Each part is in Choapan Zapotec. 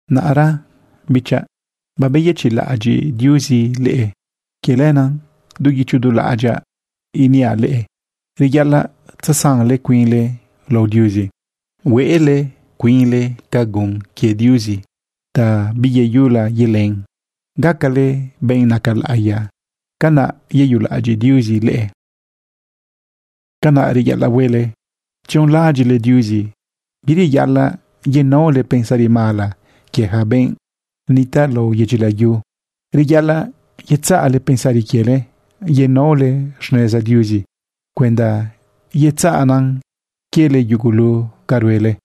Naꞌra, bichaꞌ, babeyëchiꞌlaꞌadyiꞌ Diuzi leꞌe. Quie lenaꞌ du guicho du laꞌadyaꞌ iniaꞌ leꞌe reyaꞌalaꞌ tzesanle cuinle lao Diuzi, huele cuinle ca gun quie Diuzi ta biyeyula yelen. Gacale benꞌ naca laꞌiya, canaꞌ yeyulaꞌadyiꞌ Diuzi leꞌe. Canaꞌ reyaꞌalaꞌ huele tzionlaꞌadyiꞌle Diuzi. Bireyaꞌalaꞌ yenaole pensari mala quie ja benꞌ nitaꞌ lao yedyi layu. Reyaꞌalaꞌ yetzaꞌle pensari quiele, yenaole xneza Diuzi cuenda yetzaꞌnan quiele yugulu ca ruele.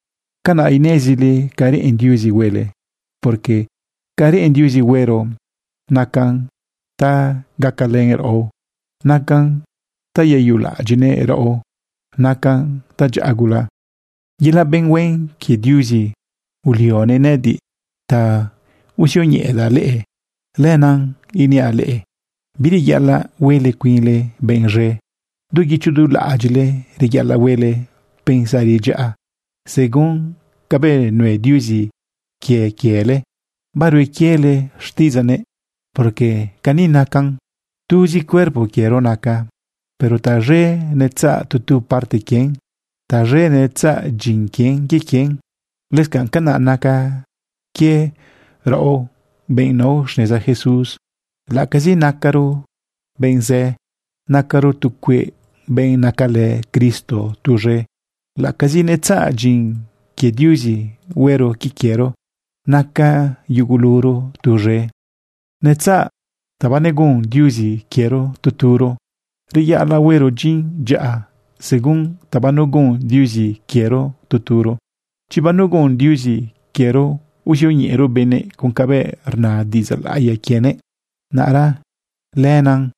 Canaꞌ inezile ca reꞌen Diuzi huele, porque ca reꞌen Diuzi huero nacan ta gacalën raꞌo, nacan ta yeyulaꞌadyiꞌnëꞌ raꞌo, nacan tadyaꞌa gula. Yelaꞌ benꞌ huen quie Diuzi ulionëꞌ nëꞌëdiꞌ ta uzioñeꞌedaꞌ leꞌe. Lenaꞌ iniaꞌ leꞌe bireyaꞌalaꞌ huele cuinle benꞌ z̃e. Du guicho du laꞌadyiꞌle reyaꞌalaꞌ huele pensari dyaꞌa según cabëꞌ nue Diuzi quie quiele barue quiele xtiꞌidzaꞌnëꞌ. Porque cani nacan: Tuzi cuerpo quiero naca, pero taz̃e netzaꞌ tu tu parte quien, taz̃e netzaꞌ dyin quie quien. Lëscanꞌ canaꞌ naca quie raꞌo benꞌ nao xneza Jesús. Laꞌacazi nacaro benꞌ zë, nacaro tu cueꞌ benꞌ nacalë Cristo tuz̃e. Laꞌacazi netzaꞌ dyin quie Diuzi huero quie quiero, naca yuguluro tuz̃e. Netzaꞌ ta banegun Diuzi quiero tu turo. Reyaꞌalaꞌ huero dyin dyaꞌa según ta banegun Diuzi quiero tu turo. Chi banegun Diuzi quiero uzioñeꞌero benëꞌ con cabëꞌ rna diꞌidzaꞌ laꞌiya quienëꞌ, naꞌra lenaꞌ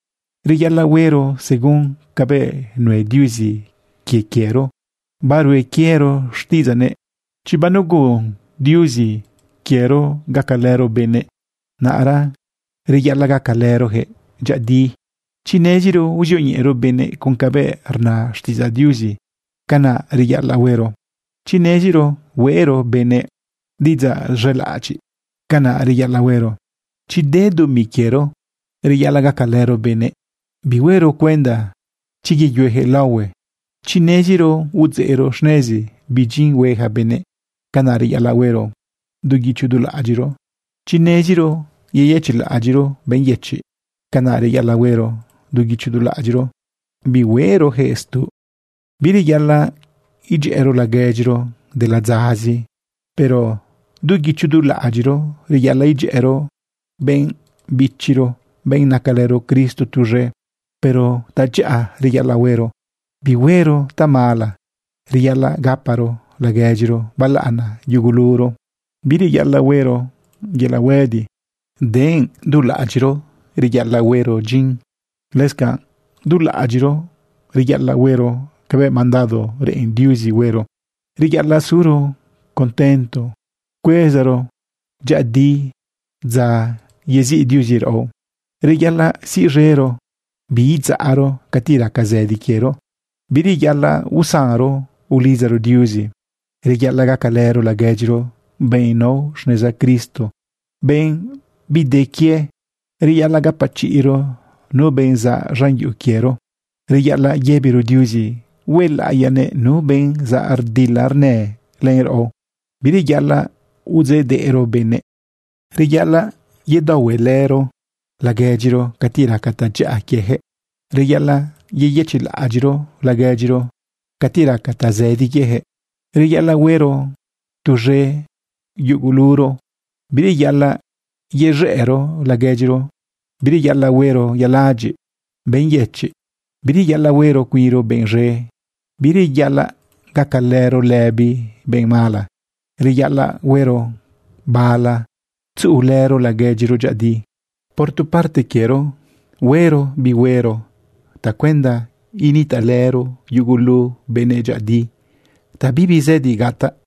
reyaꞌalaꞌ huero según cabëꞌ nue Diuzi quie quiero barue quiero xtiꞌidzaꞌnëꞌ. Chi banegun Diuzi quiero gacalëro benëꞌ, naꞌra reyaꞌalaꞌ gacalërojëꞌ dyëꞌëdi. Chi neziro uzioñeꞌero benëꞌ con cabëꞌ rna xtiꞌidzaꞌDiuzi, canaꞌ reyaꞌalaꞌ huero. Chi neziro hueꞌro benëꞌ diꞌidzaꞌ z̃elaꞌadyiꞌ, canaꞌ reyaꞌalaꞌ huero. Chi de dumi quiero, reyaꞌalaꞌ gacalëro benëꞌ, bihuero cuenda chi yeyuejëꞌ laohue. Chi neziro udzeꞌro xnezi bi dyin hue ja benëꞌ, canaꞌ reyaꞌalaꞌ huero du guicho du laꞌadyiꞌro. Chi neziro yeyëchiꞌlaꞌadyiꞌro benꞌ yëchiꞌ, canaꞌ reyaꞌalaꞌ huero du guicho du laꞌadyiꞌro, bihuerojëꞌ stuꞌ. Bireyaꞌalaꞌ idyëꞌëro laguedyiro de ladzazi, pero du guicho du laꞌ adyiꞌro reyaꞌalaꞌ idyëꞌëro benꞌ bichiro, benꞌ nacalëro Cristo tuz̃e. Puro tadyaꞌa reyaꞌalaꞌ huero, bihuero tamala. Reyaꞌalaꞌ gaparo laguedyiro balaꞌana yuguluro. Bireyaꞌalaꞌ huero yelaꞌ huëdi, denꞌ dulaꞌadyiꞌro reyaꞌalaꞌ huero dyin. Lëscanꞌ dulaꞌadyiꞌro reyaꞌalaꞌ huero cabëꞌ mandado reꞌen Diuzi huero. Reyaꞌalaꞌ suro contento cuezaro dyëꞌëdi dza yeziꞌ Diuzi raꞌo. Reyaꞌalaꞌ siꞌz̃ero biidzaꞌro cati raca zëdi quiero. Bireyaꞌalaꞌ usanro ulidzaro Diuzi. Reyaꞌalaꞌ gacalëro laguedyiro benꞌ nao xneza Cristo, benꞌ bide quie. Reyaꞌalaꞌ gapachiꞌro nu benꞌ zaꞌ z̃an yuꞌu quiero. Reyaꞌalaꞌ yëbiro Diuzi huelaꞌiyanëꞌ nu benꞌ zaꞌ rdila rnë len raꞌo. Bireyaꞌalaꞌ udzeꞌdeꞌro benëꞌ. Reyaꞌalaꞌ yedaohuelëro laguedyiro cati raca tadyaꞌa quieyaquëꞌ. Reyaꞌalaꞌ yeyëchiꞌlaꞌadyiꞌlëro laguedyiro cati raca tazëdi quieyaquëꞌ. Reyaꞌalaꞌ huero tuz̃e yuguluro. Bireyaꞌalaꞌ yez̃ëꞌro laguedyiro. Bireyaꞌalaꞌ huero yaladyiꞌ benꞌ yëchiꞌ. Bireyaꞌalaꞌ huero cuinro benꞌ z̃e. Bireyaꞌalaꞌ gacalëro lëbi benꞌ mala. Reyaꞌalaꞌ huero bala tzuꞌulëro laguedyiro dyëꞌëdi. Por tu parte quiero, huero bi huero tacuenda nitaꞌlëro yugulu benëꞌ dyëꞌëdi, ta bibi zëdi gataꞌ.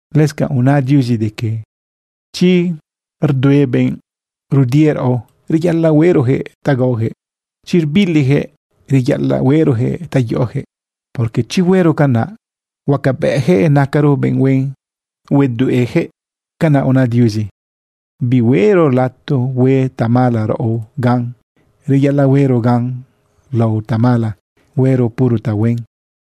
Lëscanꞌ una Diuzi de que chi rdue benꞌ rudie raꞌo, reyaꞌalaꞌ hueꞌrojëꞌ ta gaojëꞌ. Chi rbilijëꞌ, reyaꞌalaꞌ hueꞌrojëꞌ ta yoꞌojëꞌ, porque chi huero canaꞌ, huacabëꞌjëꞌ nacaro benꞌ huen yedueꞌjëꞌ. Canaꞌ una Diuzi. Bihueꞌro lato hue tamala raꞌo gan, reyaꞌalaꞌ huero gan lao tamala, huero puro tahuen.